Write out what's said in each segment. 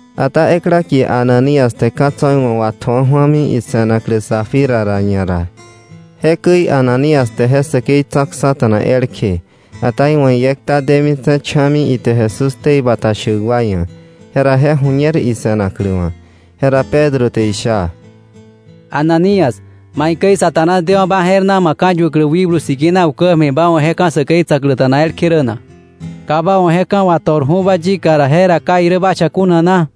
Ata ekla kie Ananías te ka̱ tso̱ iwa̱ watju̱a ju̱ami ise̱naklä Safira ra ñara. Jekäi Ananías te je säkei tsa̱ksa̱ta̱na elkje, ata iwa̱ iekta detse̱ cha̱mi ite Jesús ktei bata shäk wa ia̱. Jera je ju̱ñer ise̱naklä wa̱. Jera Pedro te isha: —Ananías, ¿maikäi Satanás dewa̱ ba je̱r na ma ka̱yuäklä Wikblu Sikina ukä ja̱mi ba wa̱ je ka̱ säkei tsa̱kläta̱na elkje rä na? Ka ba wa̱ je ka̱ wato̱rju̱ba yika ra, jera ¿ka irä ba cha kuna na?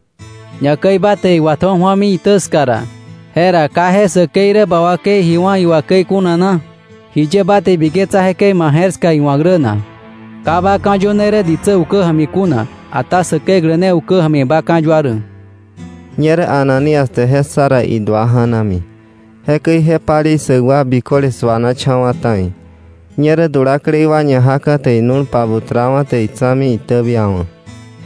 Ñakäi ba te iwatju̱a ju̱ami itä ska ra, jera ¿ka je säkei rä ba wakei ji wá̱ iwà käi kuna na? ¿Jiye ba te ibiketsa jekäi ma je̱r ska iwa̱k rä na? Ka ba ka̱yöne rä ditsä ukä ja̱mi kuna, ata Säkeklä ne ukä ja̱mi ba ka̱yua rä. Ñerä Ananías te je ssa ra, idua ja̱nami. Jekäi je palei ssäk wa biköle suanacha̱wa̱ ta̱i. Ñerä dulaklei wa ñajaka̱ te inu̱l pabutrawa̱, te itsa̱mi itäbiawa̱.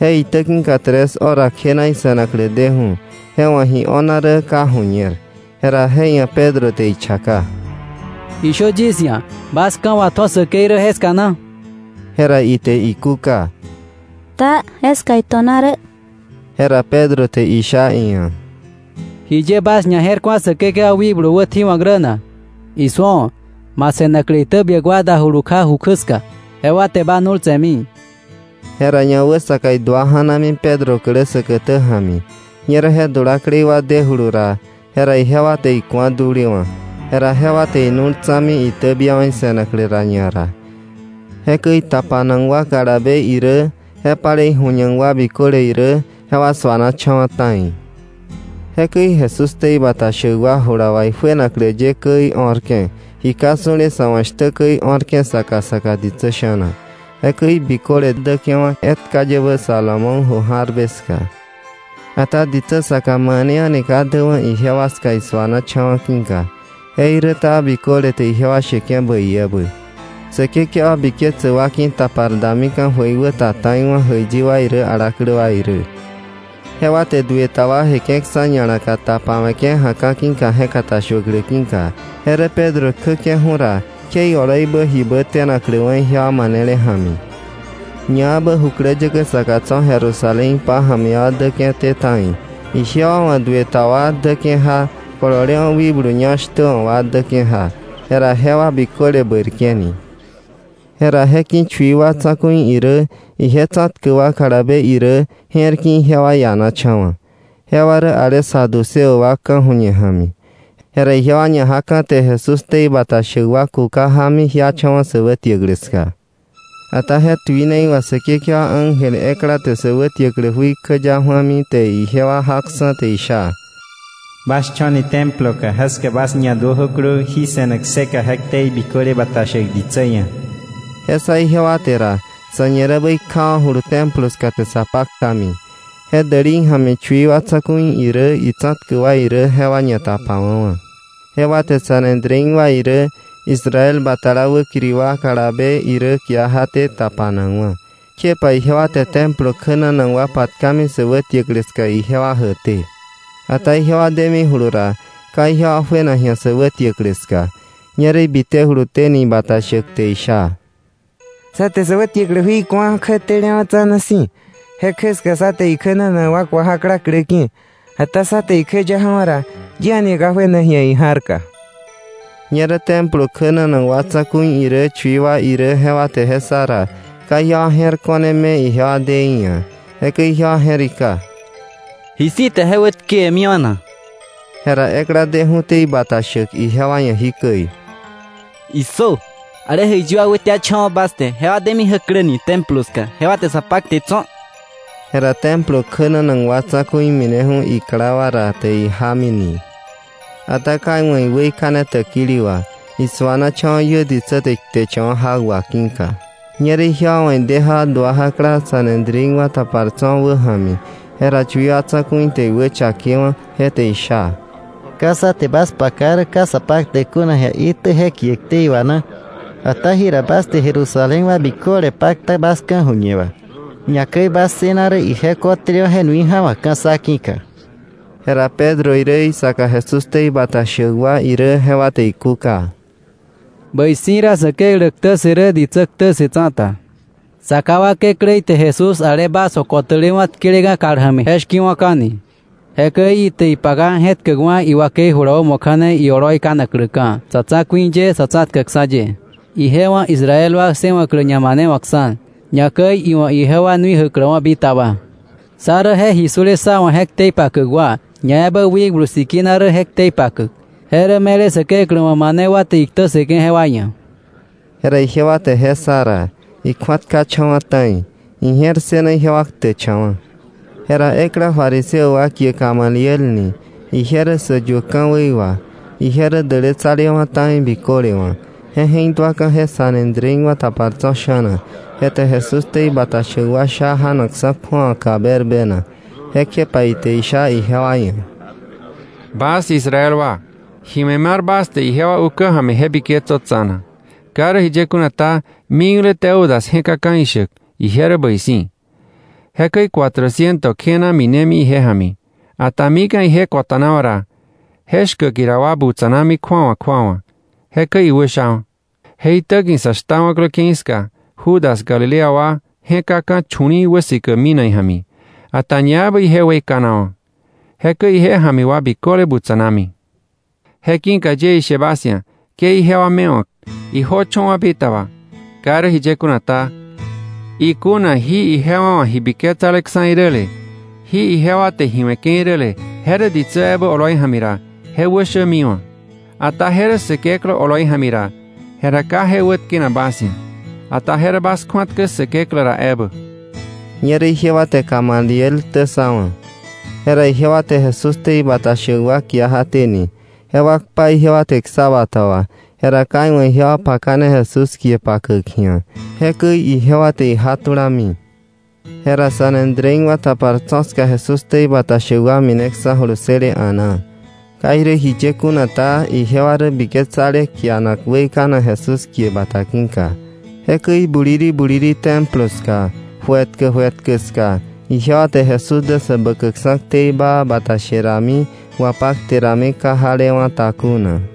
Je itä ki̱ka tres hora kjena ise̱naklä deju̱, je wa̱ ji o̱na rä ka ju̱ñer. Jera je ia̱ Pedro te ichaka: —Ishö yis ia̱, ¿bas ka̱ watju̱a säkei rä jeska na? Jera ite ikúka: —Taa, jeska ito̱na rä. Jera Pedro te isha iia̱: —¿Jiye bas ñaje̱rku̱a Säkekewa wikblu wätji̱wa̱k rä na? Isu̱o, ma se̱naklä itäbiäk wa dajulu kja ju kjä ska; jewa te ba nu̱l tse̱mi. Jera ñawäsaka idua ja̱nami Pedro klä säkätä ja̱mi. Ñerä je dulaklei wa dewa̱julu ra, jera jewa te iku̱a dulewa̱. Jera jewa te inu̱l tsa̱mi, itäbiawa̱ ise̱naklä ra ñara. Jekäi tapanak wa kalabe irä je palei ju̱ñak wa biköle irä, jewa su̱anacha̱wa̱ ta̱i. Jekäi Jesús ktei bata shäk wa jula wà ijuenaklä ye käi o̱rke̱, ji ka su̱le sa̱ wa̱ shtä käi o̱rke̱ saka saka ditsä sha̱na. Jekäi biköle däke̱wa̱ etka yebä Salomón ju jarbe ska. Ata ditsä saka mane a̱ni ka däwa̱ ijewa ska isuanacha̱wa̱ ki̱ka, jeiräta biköle te ijewa sheke̱ bäi ebä. Säkekewa biketsäk wa ki̱tapar damika̱ jöikwäta ta̱iwa̱, jäiyi wa irä alaklä wa irä. Jewa te duë ta wa jeke̱ksa̱ ña̱laka tapawe̱ke̱ ja̱ka̱ ki̱ka je̱katashuäklä ki̱ka; je rä Pedro kjäke̱ju̱ ra, kje ioloibä jibä tenakläwa̱ ijewa manele ja̱mi. Ñaebä jukläyäkä saka tso̱ Jerusalén pája̱mi wa däke̱té ta̱i. Ijewa wa̱ duë ta wa däke̱ja, kololewa̱ wikblu ñá shtä wa̱ wa däke̱ja. Jera jewa biköle bäirke̱ni. Jera je ki̱ chui wa tsa̱ku̱i irä ije tsa̱tkäk wa kalabe irä, je̱r ki̱ ijewa ianacha̱wa̱. Jewa rä ale saduceo wa ka̱ju̱ñe ja̱mi. Jera ijewa ñajaka̱, te Jesús ktei bata shäk wa kuka jámi jiacha̱wa̱ sä wätiäklä ska. Ata je tuinei wà Säkekewa ángel ekla te sä wätiäklä jui kjäya ju̱ami, te ijewa jaksa̱, te isha: “Bas cho̱ni Templo ka. Jeska bas ñaduöjöklö jí se̱ne kseka je ktei biköle bata shäk ditsä ia̱.” Je ssa ijewa te ra, sa̱ñirebä ikjawa̱julu Templo ska, te sa paktami. Je dälei ja̱mi chui wa tsa̱ku̱i irä itsa̱tkäk wa irä jewa ñatapawa̱wa̱. Jewa te Sanedrín wa irä Israel batala wäkiri wa kalabe irä kia jaté tapanakwa̱. Kjepa ijewa te Templo kjänanak wa patkami sä wätiäklä ska ijewa jäkté. Ata jewa demijulu ra, ka ijewa juena ji̱a sä wätiäklä ska. Ñerä ibitejuluténi ibata shäk, te isha: —Sá te sä wätiäklä jui ku̱a kjätelewa̱ tsa̱na si̱, je kjä ska sá te ikjänanak wa ku̱a jakla klä ki̱. Ata sá te ikjäya ja̱wa̱ ra, yi a̱ni ka juena ji̱a ija̱rka. Ñerä Templo kjänanak wa tsa̱ku̱i irä chui tsa̱ku̱i wa irä jewa te je ssa ra, ka ijewa je̱r ko̱ne me ijewa de í̱ ia̱. Jekäi ijewa je̱rika: “¿Ji si̱ te je wätkewe̱miwa̱ na?” Jera ekla deju̱té ibata shäk ijewa ia̱ jikäi: —¡Issö! Ale jäiyi wa wätiacha̱wa̱ bas te jewa demi jäkläni Templo ska, jewa te sa pakte tso̱. Jera Templo kjänanak wa tsa̱ku̱i mineju̱ ikla wa ra, te ijámini. Ata ka iwa̱ iweikane täkili wà, isu̱anacha̱wa̱ iö ditsä te ikteche̱wa̱ jak wà ki̱ka. Ñerä ijewa wa̱ ide ja dua jakla Sanedrín wa tapar tso̱ wäja̱mi. Jera chui wa tsa̱ku̱i te iwächakewa̱, je te isha: —¿Ka sá te bas paka rä ka sa paktäk kuna ji̱a itjä je kie ktei wà na? Ata jira bas te Jerusalén wa biköle pakta bas ka̱ju̱ñe wà. Ñakäi bas ssëna rä ije ko̱tälewa̱ je nui ja̱wa̱kka̱ sá ki̱ka. Jera Pedro irä isaka Jesús ktei bata shäk wa irä jewa te ikúka: —Bäi si̱ ra Säkeklä ktä ssë rä ditsä ktä ssë tsa̱ta. Sa ká wa Kekläí te Jesús ale bas wa̱ ko̱tälewa̱ tkeleka̱ kal ja̱mi, je shki̱wa̱ka̱ni. Jekäi ite ipaka je̱tkäkwa̱ iwakei jula wämo kja̱ne ioloi kanakläka̱, Sa̱tsa̱ku̱i ye, Sa̱tsa̱tkäkksa̱ ye, ije wa̱ Israel wa ssëwa̱klä ñamanewa̱ksa̱, ñakäi iwa̱ ijewa nui jäkläwa̱ bitaba. Sá rä je ji su̱le sá wa̱ je ktei pakäk wa, ñaebä Wikblu Sikina rä je ktei pakäk. Je rä me̱le Säkeklä wa̱ mane wa te iktä ssëke̱ jewa ia̱. Jera ijewa te je ssa ra, ikju̱atkacha̱wa̱ ta̱i. Ije̱r ssëna ijewa ktäkcha̱wa̱. Jera ekla fariseo wa kie Gamaliel ni, ije rä säyuäk ka̱wei wà, ije rä dälätsalewa̱ ta̱i biköle wa̱, je je̱k duaka̱ je Sanedrín wa tapar tso̱ sha̱na, je te Jesús ktei bata shäk wa sha janakksa̱ kju̱awaka berbena. Kjepa ite isha ijewa ia̱: —Bas Israel wa, ji we̱ mar bas te ijewa ukä ja̱mi je biketsö tsa̱na. Ka irä jiye kuna ta, mikle Teudas je̱kaka̱ ishäk: Ije rä bäi si̱. Jekäi cuatrociento kjena minemi ije ja̱mi. Ata mika̱ ije ko̱ta̱nawa̱ ra, je shkäk ira wa butsa̱nami kju̱awa kju̱awa. Jekäi iwäshawa̱. Je itäki̱ sa shtawa̱klä ke̱i ska Judas Galilea wa je̱kaka̱ chu̱li̱i̱ wäsikäk minak ija̱mi. Ata ñaebä ije weikanawa̱. Jekäi ije ja̱mi wa biköle butsa̱nami. Je ki̱ka yie ishe bas ia̱, ke ijewa mewa̱k, ijöcho̱wa̱ bitaba. Ka irä jiye kuna ta, ikuna jí ijewa wa̱ ji biketsaleksa̱ iräle, jí ijewa te ji we̱ke̱ iräle, je rä ditsä ebä oloi ja̱mi ra, je wäshämiwa̱. Ata je rä Säkeklä oloi ja̱mi ra, jera ka je wätkenak bas ia̱. Ata je rä bas kju̱atkä Säkeklä ra ebä. Ñerä ijewa te Gamaliel ktä ssawa̱. Jera ijewa te Jesús ktei bata shäk wa kia jaténi, jewa kpa ijewa te ksa bata wa, jera ka iwa̱ ijewa pakane Jesús kie pakäk ji̱a. Jekäi ijewa te ijatulami. Jera Sanedrín wa tapar tso̱ ska Jesús ktei bata shäk wa mineksa̱julu ssële a̱naa. Ka irä jiye kuna ta, ijewa rä biketsale kianak weikanak Jesús kie bata ki̱ka. Jekäi buliri buliri Templo ska, ju etkä ju etkä ska, ijewa te Jesús dä Säbäkäkksa̱ ktei baa bata she rami wapakte rami ka jalewa̱ta kuna.